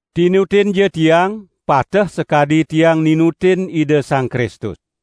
Tinutinja tiang, pateh sakadi tiang ninutin Ida Sang Kristus.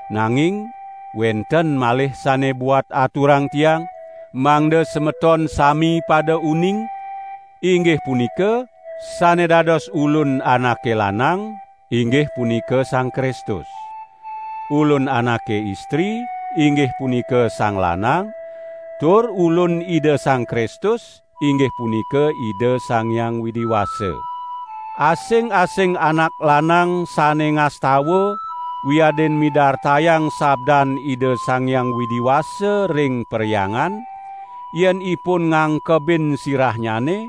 Nanging wenten malih sane buat aturang tiang, mangda semeton sami pada uning, inggih punika: sane dados ulun anake lanang, inggih punika Sang Kristus. Ulun anake istri, inggih punika sang lanang, tur ulun Ida Sang Kristus inggih punika Ida Sang Hyang Widi Wasa. Asing-asing anak lanang sane ngastawa wiadin midartayang sabdan Ida Sang Hyang Widi Wasa ring perhyangan, yen ipun ngangkebin sirahnyane,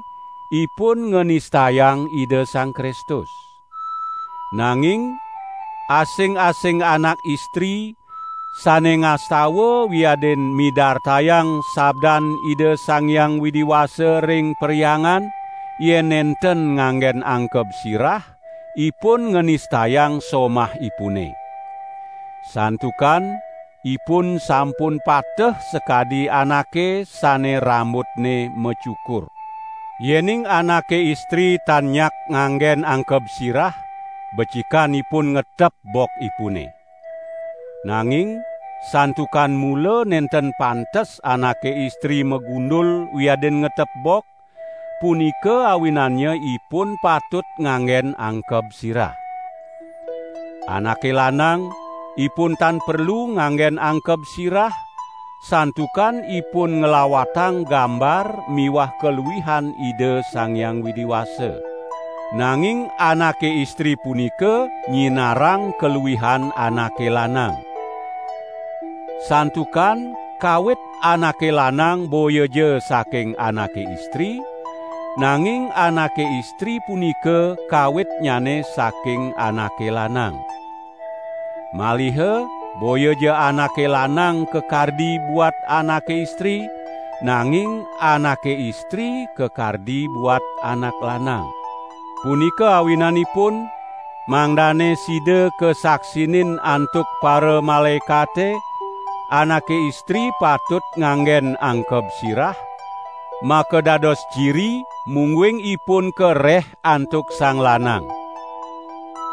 ipun nganistayang Ida Sang Kristus. Nanging asing-asing anak istri sane ngastawa wiadin midartayang sabdan Ida Sang Hyang Widi Wasa ring perhyangan yen nenten nganggen angkeb sirah, ipun nganistayang somahipune. Santukan ipun sampun pateh sakadi anake sane rambutne macukur. Yening anake istri tan nyak nganggen angkeb sirah, becikan ipun ngetep bokipune. Nanging santukan mula nenten pantes anake istri magundul wiadin ngetep bok, punika awinannya ipun patut nganggen angkeb sirah. Anake lanang, ipun tan perlu nganggen angkeb sirah santukan ipun nglawatang gambar miwah kaluihan Ida Sang Hyang Widi Wasa. Nanging anake istri punika nyinarang kaluihan anake lanang. Santukan kawit anake lanang boyaja saking anake istri, nanging anake istri punika kawitnyane saking anake lanang. Maliha boyaja anake lanang kakardi buat anake istri, nanging anake istri kakardi buat anak lanang. Punika awinanipun mangdane sida kasaksinin antuk paramalaekate anake istri patut nganggen angkeb sirah, makadados ciri mungguing ipun kareh antuk sang lanang.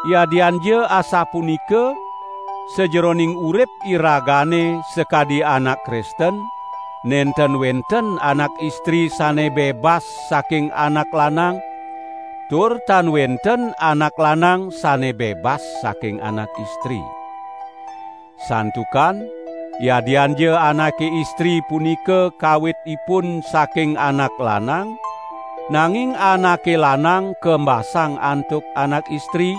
Yadianja asapunika sajeroning urip iragane sakadi anak Kristen, nenten wenten anak istri sane bebas saking anak lanang, tur tan wenten anak lanang sane bebas saking anak istri. Santukan yadianja anake istri punika kawitipun saking anak lanang, nanging anake lanang kembasang antuk anak istri;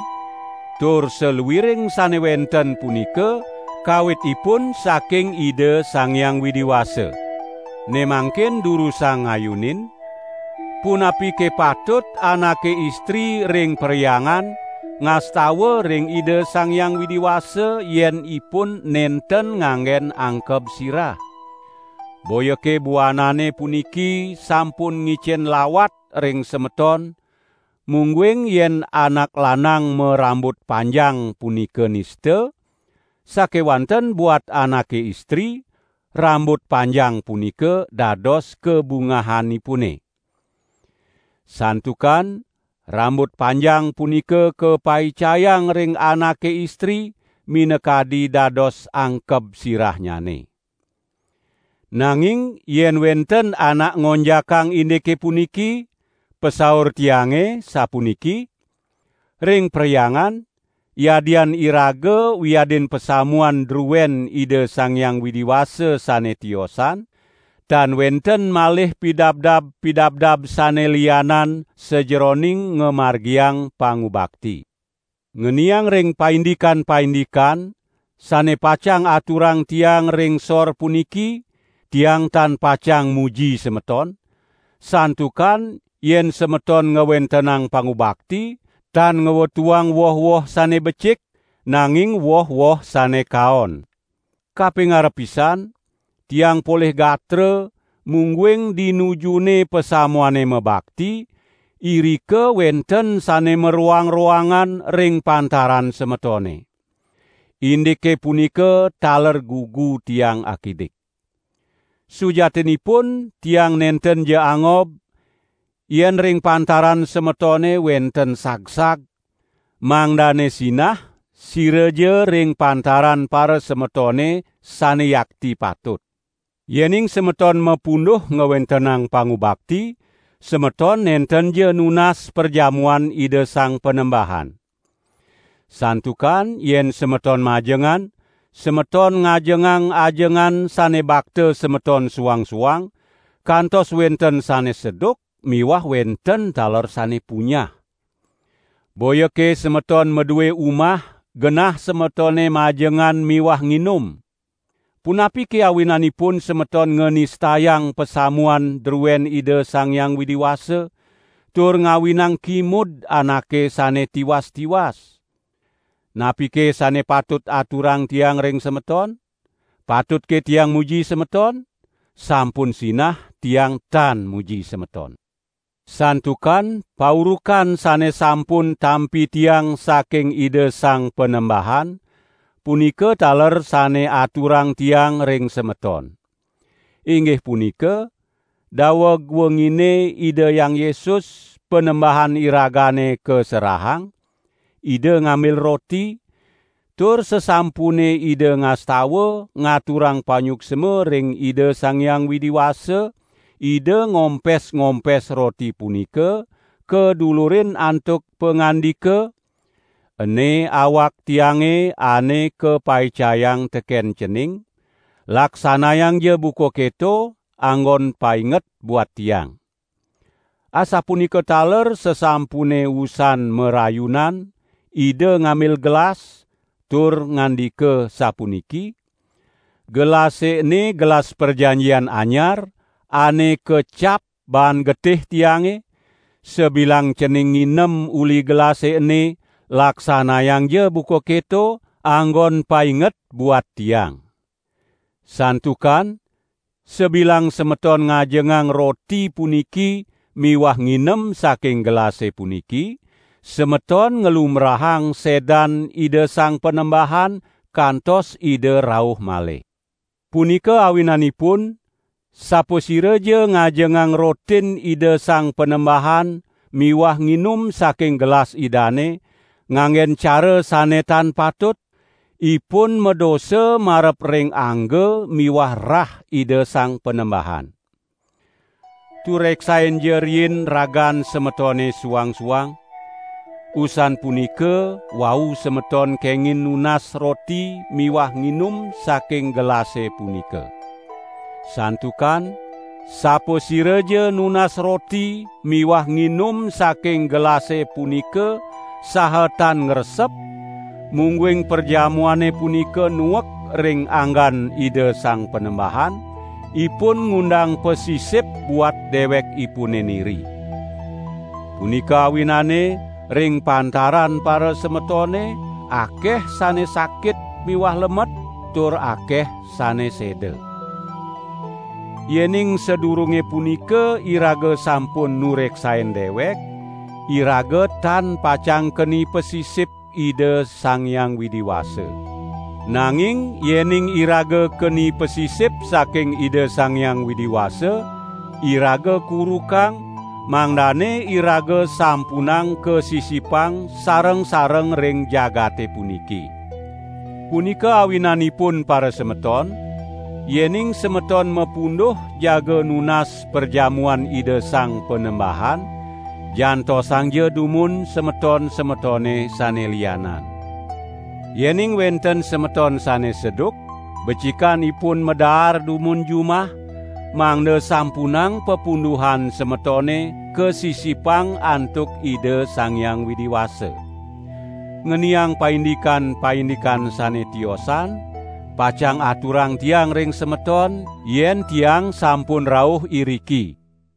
tur saluiring sane wenten punika kawitipun saking Ida Sang Hyang Widi Wasa. Ne mangkin durusang ngayunin, punapike patut anake istri ring perhyangan ngastawa ring Ida Sang Hyang Widi Wasa yen ipun nenten nganggen angkeb sirah? Boyake buanane puniki sampun ngicen lawat ring semeton mungguing yen anak lanang marambut panjang punika nista, sakewanten buat anake istri, rambut panjang punika dados kabungahanipune. Santukan rambut panjang punika kapaicayang ring anake istri minakadi dados angkeb sirahnyane. Nanging yen wenten anak ngonjakang indike puniki, pasaur tiange, sapuniki: ring perhyangan, yadian iraga wiadin pasamuan druen Ida Sang Hyang Widi Wasa sane tiosan, tan wenten malih pidabdab-pidabdab sane lianan sajeroning ngamargiang pangubakti. Ngeniang ring paindikan-paindikan sane pacang aturang tiang ring sor puniki tiang tan pacang muji semeton, santukan yen semeton ngwentenang pangubakti tan ngwetuang woh-woh sane becik, nanging woh-woh sane kaon. Kapingarep pisan, tiang polih gatra mungguing di nujune pasamuane mabakti, irika wenten sane maroang-roangan ring pantaran semetone. Indike punika taler gugu tiang akidik. Sujatinipun tiang nentenja angob, yen ring pantaran semetone wenten sagsag, mangdane sinah siraja ring pantaran parasemetone sane yakti patut. Yening semeton mapunduh ngwentenang pangubakti, semeton nentenja nunas perjamuan Ida Sang Panembahan. Santukan yen semeton majengan, semeton ngajengang ajengan sane bakta semeton suang-suang, kantos wenten sane seduk miwah wenten taler sane punyah. Boyake semeton madue umah genah semetone majengan miwah nginum? Punapike awinanipun semeton nganistayang pasamuan druen Ida Sang Hyang Widi Wasa, tur ngawinang kimud anake sane tiwas-tiwas? Napike sane patut aturang tiang ring semeton? Patutke tiang muji semeton? Sampun sinah tiang tan muji semeton! Santukan paurukan sane sampun tampi tiang saking Ida Sang Panembahan, punika taler sane aturang tiang ring semeton. Inggih punika, daweg wengine Ida Hyang Yesus, Panembahan iragane kaserahang, Ida ngambil roti, tur sasampune Ida ngastawa ngaturang panyuksma ring Ida Sang Hyang Widi Wasa, Ida ngompes-ngompes roti punika kadulurin antuk pangandika: "Ene awak Tiange ane kapaicayang teken cening, laksanayangja buka keto, anggon painget buat Tiang." Asapunika taler sasampune usan marayunan Ida ngambil gelas, tur ngandika sapuniki: "Gelase ene gelas prajanjian anyar, ane kacap baan getih Tiange; sabilang cening nginem uli gelase ene, laksanayangja buka keto, anggon painget buat Tiang." Santukan sabilang semeton ngajengang roti puniki miwah nginem saking gelase puniki, semeton nglumbrahang sedan Ida Sang Panembahan kantos Ida rauh malih. Punika awinanipun sapasiraja ngajengang rotin Ida Sang Panembahan miwah nginum saking gelas Idane, nganggen cara sane tan patut, ipun madosa marep ring angga miwah rah Ida Sang Panembahan. Tureksainja riin ragan semetone suang-suang, usan punika wau semeton kengin nunas roti miwah nginum saking gelase punika. Santukan sapasiraja nunas roti miwah nginum saking gelase punika saha tan ngresep, mungguing perjamuane punika nuek ring anggan Ida Sang Panembahan, ipun ngundang pasisip buat dewekipune niri. Punika awinane ring pantaran parasemetone akeh sane sakit miwah lemet, tur akeh sane seda. Yening sadurunge punika iraga sampun nureksain dewek, iraga tan pacang keni pasisip Ida Sang Hyang Widi Wasa. Nanging yening iraga keni pasisip saking Ida Sang Hyang Widi Wasa, iraga kurukang, mangdane iraga sampunang kasisipang sareng-sareng ring jagate puniki. Punika awinanipun parasemeton, yening semeton mapunduh jaga nunas perjamuan Ida Sang Panembahan, jantosangja dumun semeton-semetone sane lianan. Yening wenten semeton sane seduk, becikan ipun madaar dumun jumah, mangda sampunang papunduhan semetone kasisipang antuk Ida Sang Hyang Widi Wasa. Ngeniang paindikan-paindikan sane tiosan pacang aturang tiang ring semeton yen tiang sampun rauh iriki.